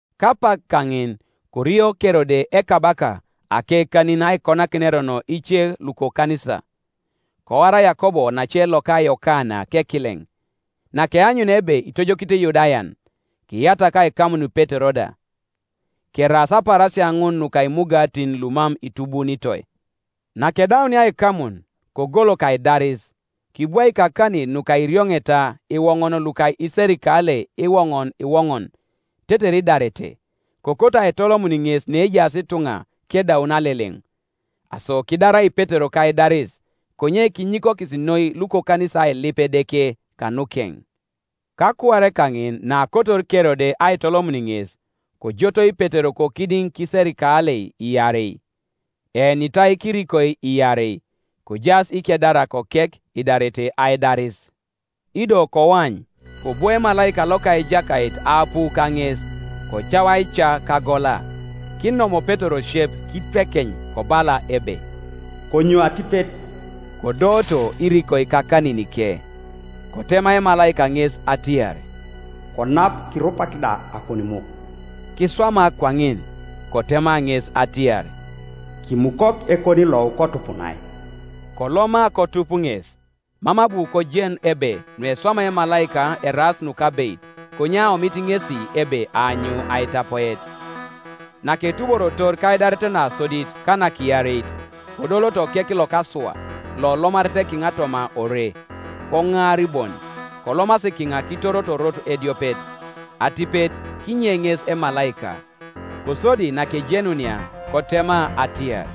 Kapak kaŋin korio Kerode ekabaka akekanin aikonakin erono ice lukokanisa. Koar Yakob onace loka Yokana kekileŋ; nakeanyunia ebe itojokito Iyudayan, kiyatak aikamun Petero da. Keraas apaarasia ŋun nuka Imugatin lumam itubuunitoi. Nakedaunia aikamun, kogolok aidaris, kibwaik akanin nuka irioŋeta iwoŋon luka iserikalei iwoŋon iwoŋon, tetere idarete; kokoto aitolomun ŋes neejaas ituŋa kedaun Aleleŋ. Aso kidarai Petero kaidaris; konye kinyikokis noi lukokanisa ailip Edeke kanukeŋ. Kakuar kaŋin naakotor Kerode aitolomun ŋes, kojotoi Petero kokidiŋ kiserikalei iarei, eenitai kirikoi iarei, kojaas ikedarak okek idarete aidaris; ido koany, kobwo emalaika loka Ejakait aapu kaŋes, kocau aica kagola; kinom Petero osiep kitwekeny, kobala ebe, “Konyou atipet.” Kodooto irikoi kakaninike. Kotema emalaika ŋes atiar, “Konap, kirupak da akonimuk.” Kiswama kwaŋin, Kotema ŋes atiar, “Kimukok ekonilou, kotupunai.” Koloma kotup ŋes; mam abu kojen ebe nueswamai emalaika eraas nukabeit, konye aomit ŋesi ebe aanyu aitapoet. Naketuborotor kaidaret nasodit ka nakiareit, kodoloto okek lokasua lolomaret kiŋa toma ore; koŋaari bon, kolomasi kiŋa kitoroto orot ediopet; atipet kinye ŋes emalaika. Kosodi nakejenunia kotema atiar,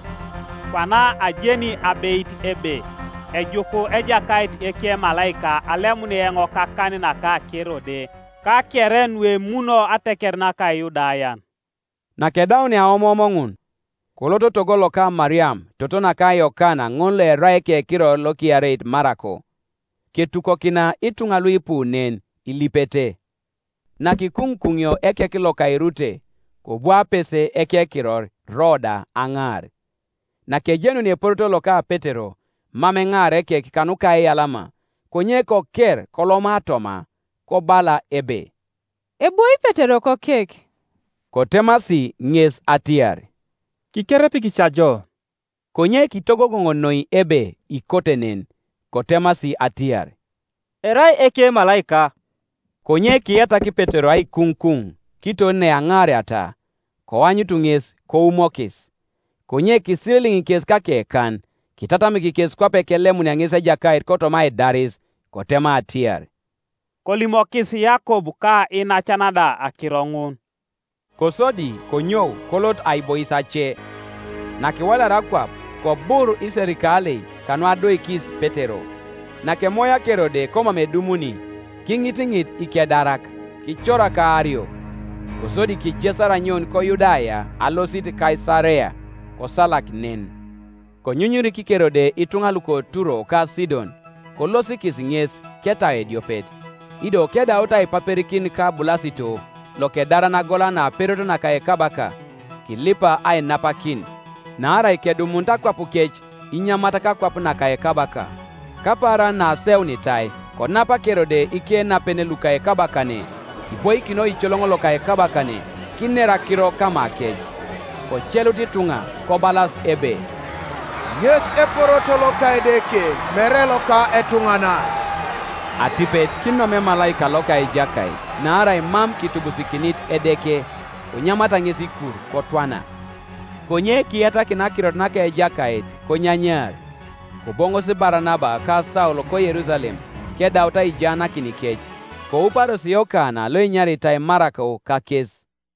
“Kwana ajeni abeit ebe ejuku Ejakait ekemalaika alemun eoŋ kakan naka Kerode ka kere nuemuno ateker naka Iyudayan.” Nakedaunia aomoom ŋun, kolot togo loka Mariam, toto naka Yokana ŋol loerai ekekiror lokiareit Marako; ketukokina ituŋa luipu nen, ilipete. Nakikuŋukuŋio ekek loka erute, kobu apese ekekiror Roda ajaar. Nakejenunia eporoto loka Petero, mam eŋaara ekek kanuka aiyalama, konye koker koloma toma, kobala ebe, “Ebwoi Petero kokek.” Kotemasi ŋes atiar, “Kikerepiki ca ijo.” Konye kitogogoŋ noi ebe ikote nen. Kotemasi atiar, “Erai ekemalaika.” Konye kiyatak Petero aikuŋukuŋ; kiton neaŋaariata, koanyutu ŋes, koumokis. Konye kisililiŋ kes kakekan, kitatamik kes kwape kelemunia ŋes Ejakait kotoma aidaris. Kotema atiar, “Kolimokis Yakob ka iinacan da akiro ŋun.” Kosodi konyou kolot aibois ace. Nakiwalaria akwap, kobur iserikalei kanuadoikis Petero, Nakemoia Kerode komam edumuni, kiŋitiŋit ikedarak, kicorak aario. Kosodi kijesar anyoun koYudaya alosit Kaisarea, kosalak nen. Konyunyurik Kerode ituŋa luko Turo ka Sidon, kolosikis Ŋes ketau ediopet, ido kedaut aipaperikin ka Bulasito, lokedaran agola naperot naka ekabaka, kilipa ainapakin, naarai kedumunit akwapukec inyamat kakwap naka ekabaka. Kapaaran naaseunitai konap Kerode ikenapen luka ekabakane, kiboikin oicoloŋ loka ekabakane, kiner akiro kamakec. Kocelut ituŋa kobalas ebe, “Ŋes eporoto loka edeke, mere loka etuŋanan!” Atipet kinom emalaika loka Ejakait, naarai mam kitubusikinit Edeke; konyamata ŋes ikur, kotwana. Konye kiyatakin akirot naka Ejakait, konyanyaar. Koboŋosi Baranaba ka Saul koYerusalem, kedaut aijaanakinikec, kouparos Yokana loenyaritai Marako kakes.